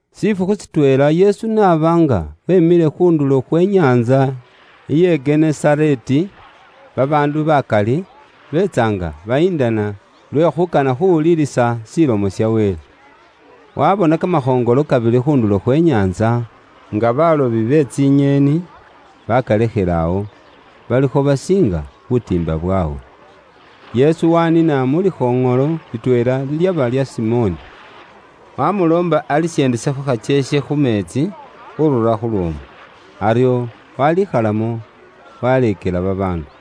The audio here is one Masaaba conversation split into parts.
Shifukhu shitweela, Yesu aaba nga weemile khu ndulo khwe inyaantsa ye Genesareeti, babaandu bakali beetsa nga bayindana lwe khuukana khuuwuliilisa Ilomo ya Wele. Waabona kamakhoŋolo kabili khu ndulo khwe inyaantsa, nga baalobi be tsinyeeni baakalekhile awo, balikho basiinga butiimba bwaabwe. Yesu waaniina mu likhoŋolo litweela lilyaba lya Simoni, waamuloomba alisyendesekho khakyeekhe khu meetsi khurura khu lwoomu. Aryo waaliikhalamo, waaleekela babaandu.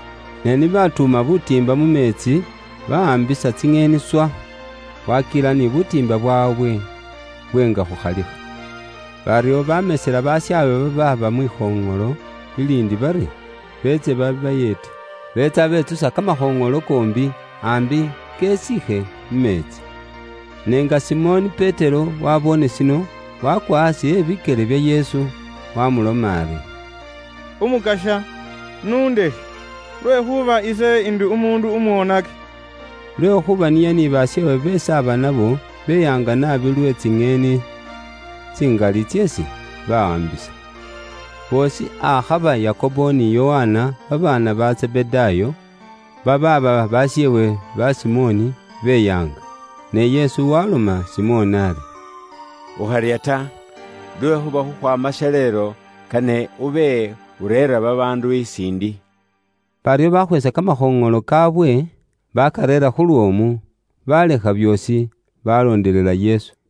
Ne ni baatuuma butiimba mu meetsi, bawaambisa tsinyeeni swa, waakila ni butiimba bwaabwe bwenga khukhalikha. Baryo baamesela bashaabwe babaaba mwikhoŋolo liliindi bari beetse babayeete. Beetsa betsusa kamakhoŋolo koombi, aambi kesiikhe mu meetsi. Ne nga Simoni Petero waaboone shino, waakwa aasi ebikyele bya Yesu, waamuloma ari, “Umukasya, n'undekhe, lwekhuuba ise ndi umuundu umwoonaki.” Lwekhuuba niye ni basheewe beesi aaba nabo, beyaanga naabi lwe tsinyeeni tsingali tseesi baawaambisa. Boosi akhaba Yakobo ni Yokana, babaana ba Zebedaayo, babaaba basheewe ba Simoni, beyaanga naabi. Ne Yesu waaloma Simoni ari, “Ukharya ta, lwekhuuba khukhwaama shaleelo, kane ube ureera babaandu isiindi.” Baryo bakhweesa kamakhoŋolo kaawe baakareera khu lwoomu, baalekha byoosi, baaloondelela Yesu.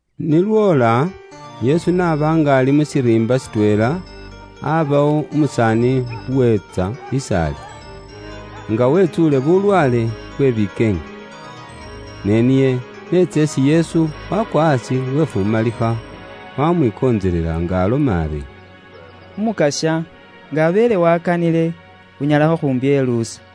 Ni lwoola, Yesu n'aba nga ali mu shiriimba shitweela, abawo umusaani uweetsa is'ali, nga wetsuule bulwaale bwe bikeenge. Ne niye n'etsa isi Yesu, wakwa aasi wefumalikha, wamwikontselela nga aloma ari, “Umukasya nga abeele wakanile, unyala khukhumpyeluusa.”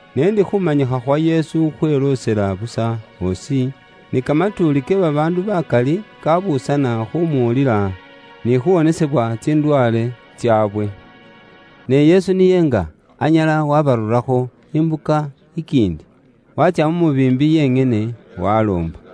Ne ndi khumanyikha khwa Yesu khweloosela busa osi, ni kamatuuli ke babaandu bakali, kabuusana khumuwulila ni khuwonesebwa tsindwaale tsaabwe. Ne Yesu niye nga anyala wabarurakho imbuka ikiindi, waatsya mu mubiimbi yenyene, waloomba.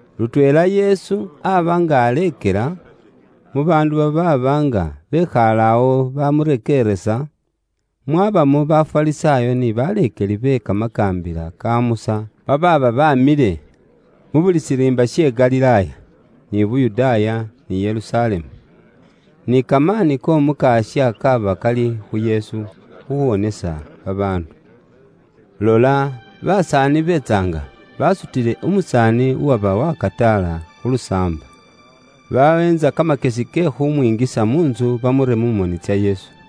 Lutweela Yesu aba nga aleekela, mu baandu babaaba nga bekhaale awo bamurekeeresa, mwabamo Bafarisaayo ni baleekeli be Kamakaambila ka Musa babaaba bamile mu buli shiriimba she, Galilaaya, ni Yuda ni Yerusalemu. Ni kamaani k'Omukasya kaaba kali khu Yesu khuwonesa babaandu. Lola basaani beetsa nga basutile umusaani uwaba wakataala khu lusaamba, baweentsa kamakyesi ke khumwingisa mu ntsu bamure mu moni tsa Yesu.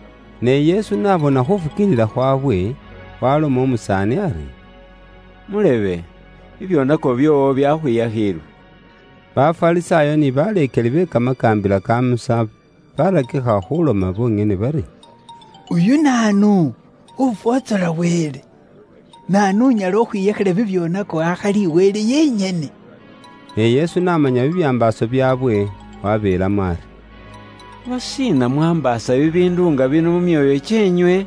Ne Yesu n'abona khufukiilila khwawe, waloma umusaani ari, “Mulebe, bibyoonako byoowo byakhwiyakhiilwe!” Bafarisaayo ni baleekeli be Kamakaambila ka Musa barakikha khuloma bonyene bari, “Uyu naanu, ufwotsola Wele? Naanu unyala khukhwiyakhila bibyoonako akhali Wele yenyene?” Ne Yesu n'amanya bibyambaaso byaabwe, wabeelamo ari, “Lwashiina mwaambaasa bibiindu nga bino mu myoyo kyeenywe?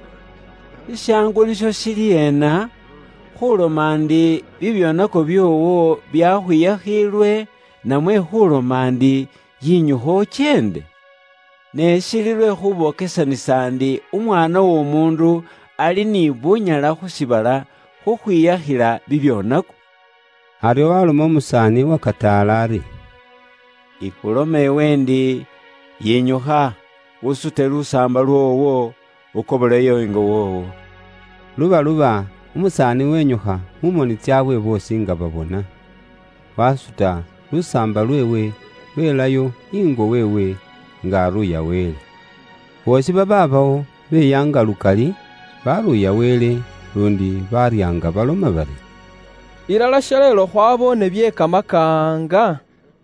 Shishaangu nisho shili ena? Khuloma ndi, ‘Bibyoonako byoowo byakhwiyakhiilwe’, namwe khuloma ndi, ‘Yinyukha ukyeende?’ Ne shili lwe khubokesanisa ndi Umwaana w'Omuundu ali ni bunyala khu shiibala khukhwiyakhila bibyoonako.” Aryo waloma umusaani uwakataala ari, “Ikhuloma iwe ndi, yinyukha, usute lusaamba lwoowo, ukoboleyo ingo woowo.” Lubaluba, umusaani winyukha mu moni tsaabwe boosi nga babona, wasuta lusaamba lweewe, welayo ingo weewe, nga aruuya Wele. Boosi babaabawo, beyaanga lukali, baruuya Wele, luundi baarya nga baloma bari, “Ilala shaleelo khwaboone bye kamakaanga!”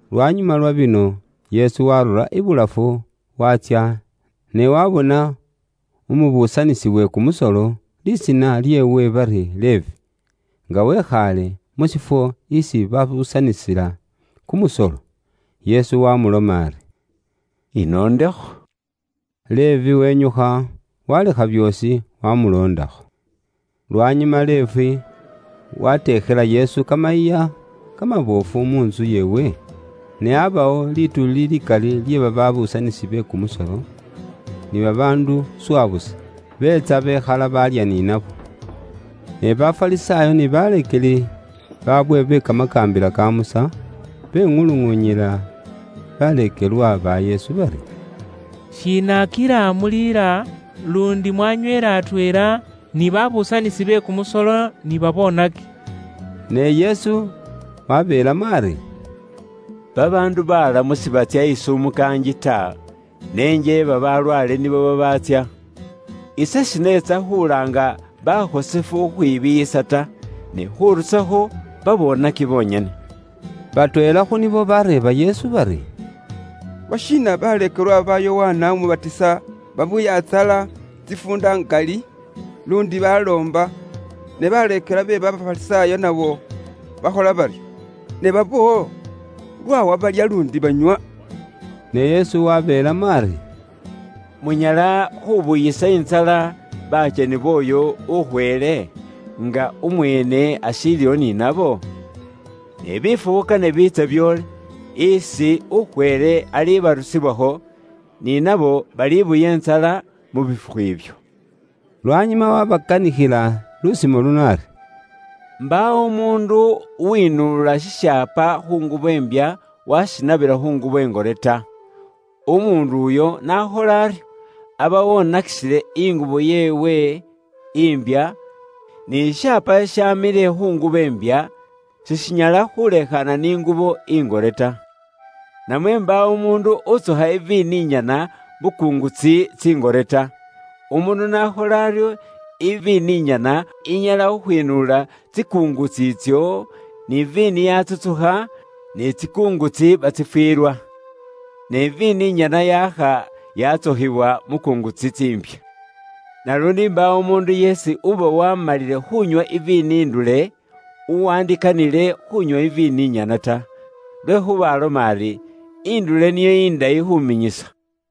Lwanyuma lwa bino, Yesu waarura ibulafu waatsya, ne waabona umubuusanisi we kumusolo, lisiina lyeewe bari Levi, nga wikhaale mu shifwo isi babuusanisila kumusolo. Yesu wamuloma ari, “Inondekho.” Levi wenyukha, walekha byoosi wamuloondakho. Lwanyuma Levi wateekhela Yesu kamayiiya kamaboofu mu ntsu yeewe, ne abaawo lituuli likali lye babuusanisi be kumusolo ni babaandu swa busa, beetsa bekhala baalya ni nabo. Ne Bafarisaayo ni baleekeli baabwe be Kamakaambila ka Musa, beŋuluŋuunyila baleekelwa ba Yesu bari, “Shiina kila muliila, luundi mwanyweela atweela ni babuusanisi be kumusolo ni babonaki?” Ne Yesu wabeelamo ari, “Babaandu balamu sibatsya isi umukaangi ta, ne njeeba balwaale nibo babaatsya. Ise shineetsa khulaanga bakhosefu khukhwibiiyisa ta, ne khurusakho babonaki bonyene.” Batweela khu nibo bareeba Yesu bari, “Lwashiina baleekelwa ba Yokana Umubatisa babuya intsala tsifuunda ngali, luundi baloomba, ni baleekelwa be Bafarisaayo nabo bakhola baryo, ne baboowo lwaawa balya luundi banywa?” Ne Yesu wabeelamo ari, “Munyala khubuyisa intsala bakyeni booyo ukhweele, nga umweene ashiiliwo ni nabo? Ne bifukhu kane biitse byoole, isi ukhweele alibarusibwakho, ni nabo balibuya intsala mu bifukhu ibyo.” Lwanyuma waabakanikhila lusimo luno ari: “Mbaawo umuundu uwinuula shishaapa khu ngubo imbya, waashinabila khu ngubo ingore ta. Umuundu uyo n'akhola aryo, aba wonakisile ingubo yeewe imbya, ni shishaapa shishamile khu ngubo imbya, sishinyala khulekhaana ni ngubo ingore ta. Namwe mbaawo umuundu utsukha iviini inyana mu kungutsi tsingore ta. Umuundu n'akhola aryo, iviini inyana inyala khukhwinuula tsikungutsi itsyo, ni viini yatsutsukha, ni tsikungutsi batsifiilwa. Ne iviini nyana yaakha yatsukhiwa mu kungutsi tsiimbya. Naluundi mbaawo umuundu yeesi uba waamalile khuunywa iviini indule, uwandikanile khuunywa iviini inyana ta, lwekhuuba aloma ari, ‘Indule niyo indayi khuminyisa.’”